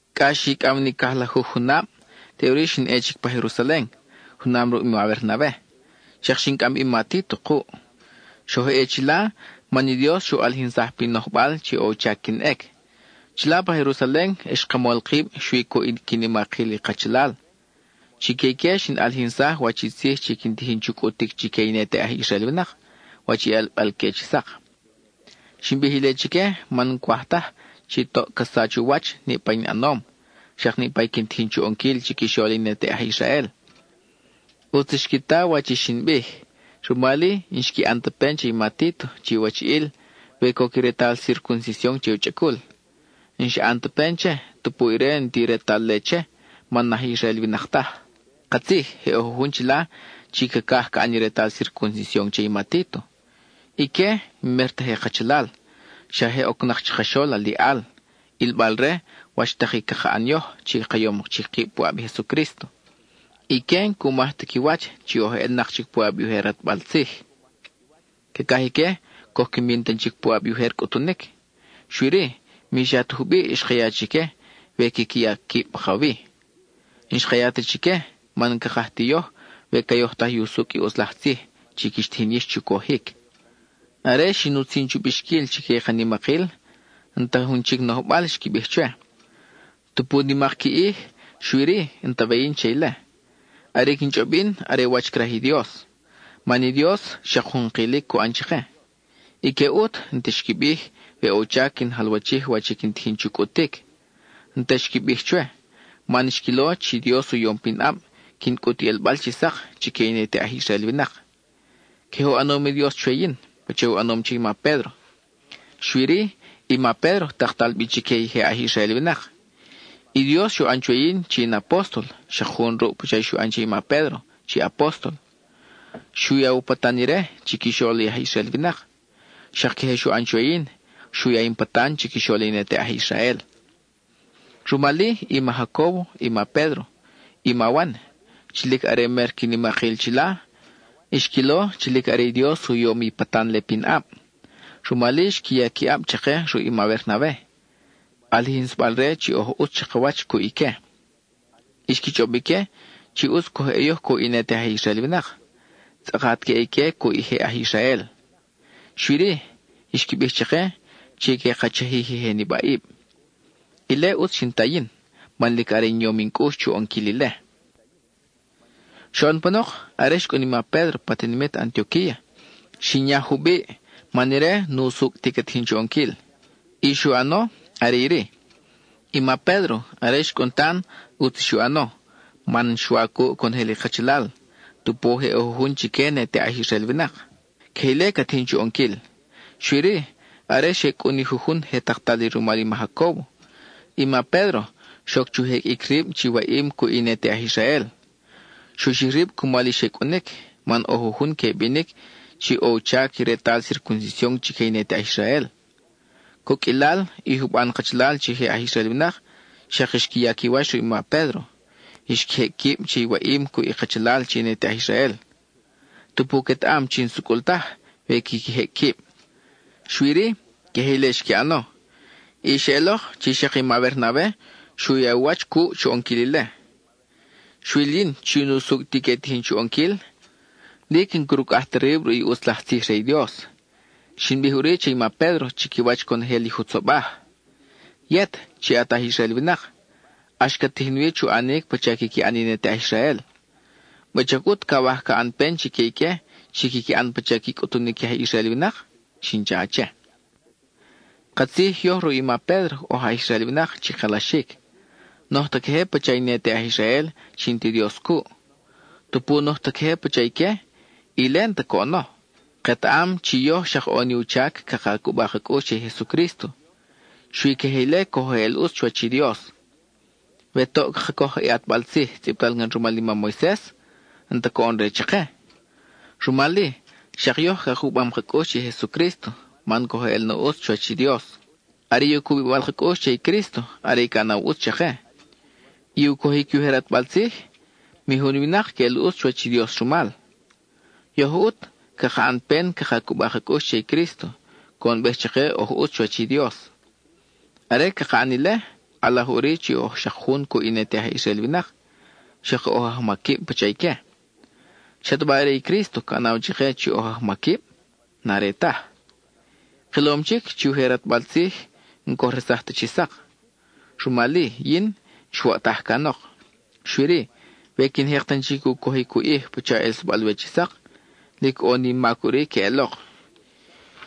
Cʼa xicʼaw ni cajlajuj junab, teʼuri xin ʼe chic pa Jerusalen, junam ruʼ i ma Bernabe; xak xin cʼam bi i ma Títo kuʼ. Xoj ʼe chila man i Dios xu ʼalijinsaj pin nojbal chi ʼo u chac quin ʼec. Chila pa Jerusalen, xka mol kib xui cuʼ i qui nimakil i kachalal; chique ique xin ʼalijinsaj wach i tzij chi quin tijin chu cʼutic chique i ne te aj Israel winak, wach i ʼelbal-que chi sak. Xin bij ile chique man n-cwaj taj chi toʼ ca sach u wach niʼpa in ʼanom, xak niʼpa i quin tijin chu ʼonquil chiquixol i ne te aj Israel. ʼUtz xqui ta wach i xin bij, rumal-i n-xqui ʼan ta pen che i ma Títo chi wachiʼil, we coc i retal circuncision che u chʼacul. N-xa ʼan ta pen che, tupu ire n-ti retal-le che man n-aj Israel winak taj. Katzij je ʼo jujun chila chi cacaj ca ʼan i retal circuncision che i ma Títo. Ique n-mer ta je kachalal, xa je ocnak chakaxol aliʼal, ʼilbal re wach tak i caka ʼan yoj chi ka yom chic kib puʼab i Jesucrísto. Ique n-cu maj ta qui wach chi oj ʼelnak puʼab i ujer ʼatbal tzij. Cacaj ique coj qui min tan chic puʼab i ujer cʼutunic. Xui-ri, mi xa ta jubiʼ xka ya chique we quiqui ya quib pakawi. N-xka ya ta chique, man n-cakaj ti yoj we ca yojtaj i usucʼ i ʼutz laj tzij chi quix tijin yix chu cojic. Are xin utzin chu bixquil chique i ka nimakil, n-ta jun chic nojbal xqui bij chwe. Tupu nimak qui ʼij, xui-ri, n-ta we yin che ile; are i quin chʼob yin are wach i craj i Dios. Man i Dios, xak jun kilic cu ʼan chake. Ique ʼut, n-ta xqui bij, we ʼo u chac quin jalwachij wach i quin tijin chu cʼutic. N-ta xqui bij chwe, man xquilo chi i Dios u yom pinʼab quin cʼut i ʼelbal chi sak chique i ne te aj Israel winak. Queje u ʼanom i Dios chwe yin pacha u ʼanom che i ma Pédro; xui-ri i ma Pédro taktal bi chique i je aj Israel winak. I Dios xu ʼan chwe yin chi in apóstol, xak jun ruʼ pacha xu ʼan che i ma Pédro chi apóstol; xu ya u patan ire, chiquixol i aj Israel winak, xak queje xu ʼan chwe yin, xu ya in patan chiquixol i ne te aj Israel. Rumal-i, i ma Jacóbo, i ma Pédro, i ma Wan, chi lic are mer qui nimakil chila, xquilo chi lic are i Dios u yom i patan-le pinʼab. Rumal-i, xqui ya qui ʼab chake ruʼ i ma Bernabe, ʼalijinsabal-re chi oj ʼutz chakawach cuʼ ique. Xqui chʼob ique chi ʼutz coj ʼe yoj cuʼ i ne te aj Israel winak, tzʼakat que ʼe ique cuʼ i je aj Israel. Xui-ri, xqui bij chake chi que ka chajij i je nibaʼib. Ile ʼutz xin ta yin, man lic are in yom in cʼux chu ʼonquil ile. Xoʼon panok, are xcʼun i ma Pédro pa tinimit Antioquía, xin yaj jubiʼ man ire n-usucʼ ti ca tijin chu ʼonquil. I xu ʼano are iri: i ma Pédro, are xcʼun tan, ʼutz i xu ʼano man xwa cuʼ conojel i kachalal, tupu je ʼo jujun chique ne te aj Israel winak. Queje ile ca tijin chu ʼonquil, xui-ri, are xe cʼun i jujun je taktal li rumal i ma Jacóbo, i ma Pédro xoc chu jeqʼuic rib chi waʼim cuʼ i ne te aj Israel. Xu xij rib cumal i xe cʼunic man ʼo jujun que binic chi ʼo u chac i retal circuncision chique i ne te aj Israel. Coqʼuilal i juban kachalal chi je aj Israel winak, xak xqui ya qui wach ruʼ i ma Pédro, xqui jecʼ quib che i waʼim cuʼ i kachalal chi ne te aj Israel, tupu quetaʼam chi n-sucʼul taj we quiqui jecʼ quib. Xui-ri, queje ile xqui ʼano, y xeʼelok chi xak i ma Bernabe xu ya u wach cuʼ chu ʼonquil ile. Xwil yin chi n-usucʼ ti que tijin chu ʼonquil, lic n-crucʼaj ta rib ruʼ i ʼutz laj tzij re i Dios. Xin bij ʼuri che i ma Pédro chiquiwach conojel i jutzobaj: “Yet, chi at aj Israel winak, ʼax cat tijin wi chu ʼanic pacha quiqui ʼan i ne te aj Israel, ¿wuchac ʼut cawaj ca ʼan pen chique ique chi quiqui ʼan pacha qui cʼutunic i aj Israel winak?” xin cha che. Katzij yoj ruʼ i ma Pédro oj aj Israel winak chi kalaxic, n-oj ta queje pacha i ne te aj Israel chi n-ti Dios cuʼ. Tupu n-oj ta queje pacha ique, ile n-ta coʼono; ketaʼam chi yoj xak ʼo ni u chac caka cuba ka cʼux che i Jesucrísto. Xui queje ile coj eʼel ʼutz chuwach i Dios. We toʼ caka coj i ʼatbal tzij tzʼibtal can rumal i mam Moises, n-ta coʼon-re chake. Rumal-i, xak yoj ka cubam ka cʼux che i Jesucrísto, man coj eʼel na ʼutz chuwach i Dios. Are i u cubibal ka cʼux che i Crísto are i ca ʼanaw ʼutz chake; i u cojic i ujer ʼatbal tzij, mi jun winak queʼel ʼutz chuwach i Dios rumal. Yoj ʼut caka ʼan pen caka cuba ka cʼux che i Crísto, coʼonbej chake oj ʼutz chuwach i Dios. Are caka ʼan ile, ʼalaj ʼuri chi oj xak jun cuʼ i ne te aj Israel winak, xak oj ajmaquib pacha ique. ¿Xataba are i Crísto ca ʼanaw chake chi oj ajmaquib? N-are taj. Kilom chic chi i ujer ʼatbal tzij n-coj resaj ta chi sak, rumal-i yin xwoʼtaj canok. Xui-ri, we quin jek tan chic u cojic u ʼij pacha ʼelsabal-we chi sak, lic ʼo ni in mac ʼuri queʼelok.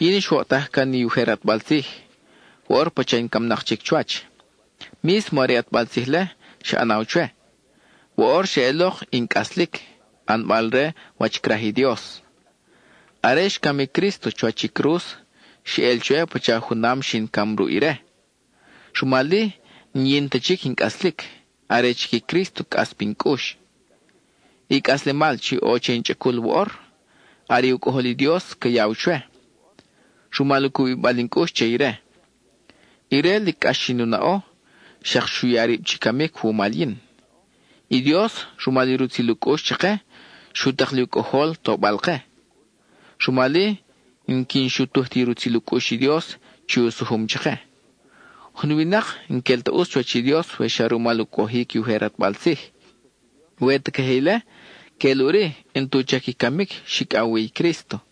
Yin xwoʼtaj can i ujer ʼatbal tzij; woʼor pacha in camnak chic chuwach. Mísmo are i ʼatbal tzij-le xa ʼanaw chwe; woʼor xeʼelok in cʼaslic ʼanbal-re wach craj i Dios. Are xcam i Crísto chuwach i cruz, xeʼel chwe pacha junam xin cam ruʼ ire; rumal-i, n-yin ta chic in cʼaslic, are chic i Crísto cʼas pin cʼux. I cʼaslemal chi ʼo che in chʼacul woʼor, are i u Cʼojol i Dios ca yaw chwe, rumal u cubibal in cʼux che ire. Ire, lic cʼax xin u naʼo, xak xu ya rib chi camic wumal yin. I Dios, rumal i rutzil u cʼux chake, xu tak li u Cʼojol tobal-ke; rumal-i n-quin xutuj ti rutzil u cʼux i Dios chi u sujum chake. Jun winak n-quel ta ʼutz chuwach i Dios we xa rumal u cojic i ujer ʼatbal tzij. We ta queje ile, queʼel ʼuri n-tu chac i camic xicʼaw wi i Crísto.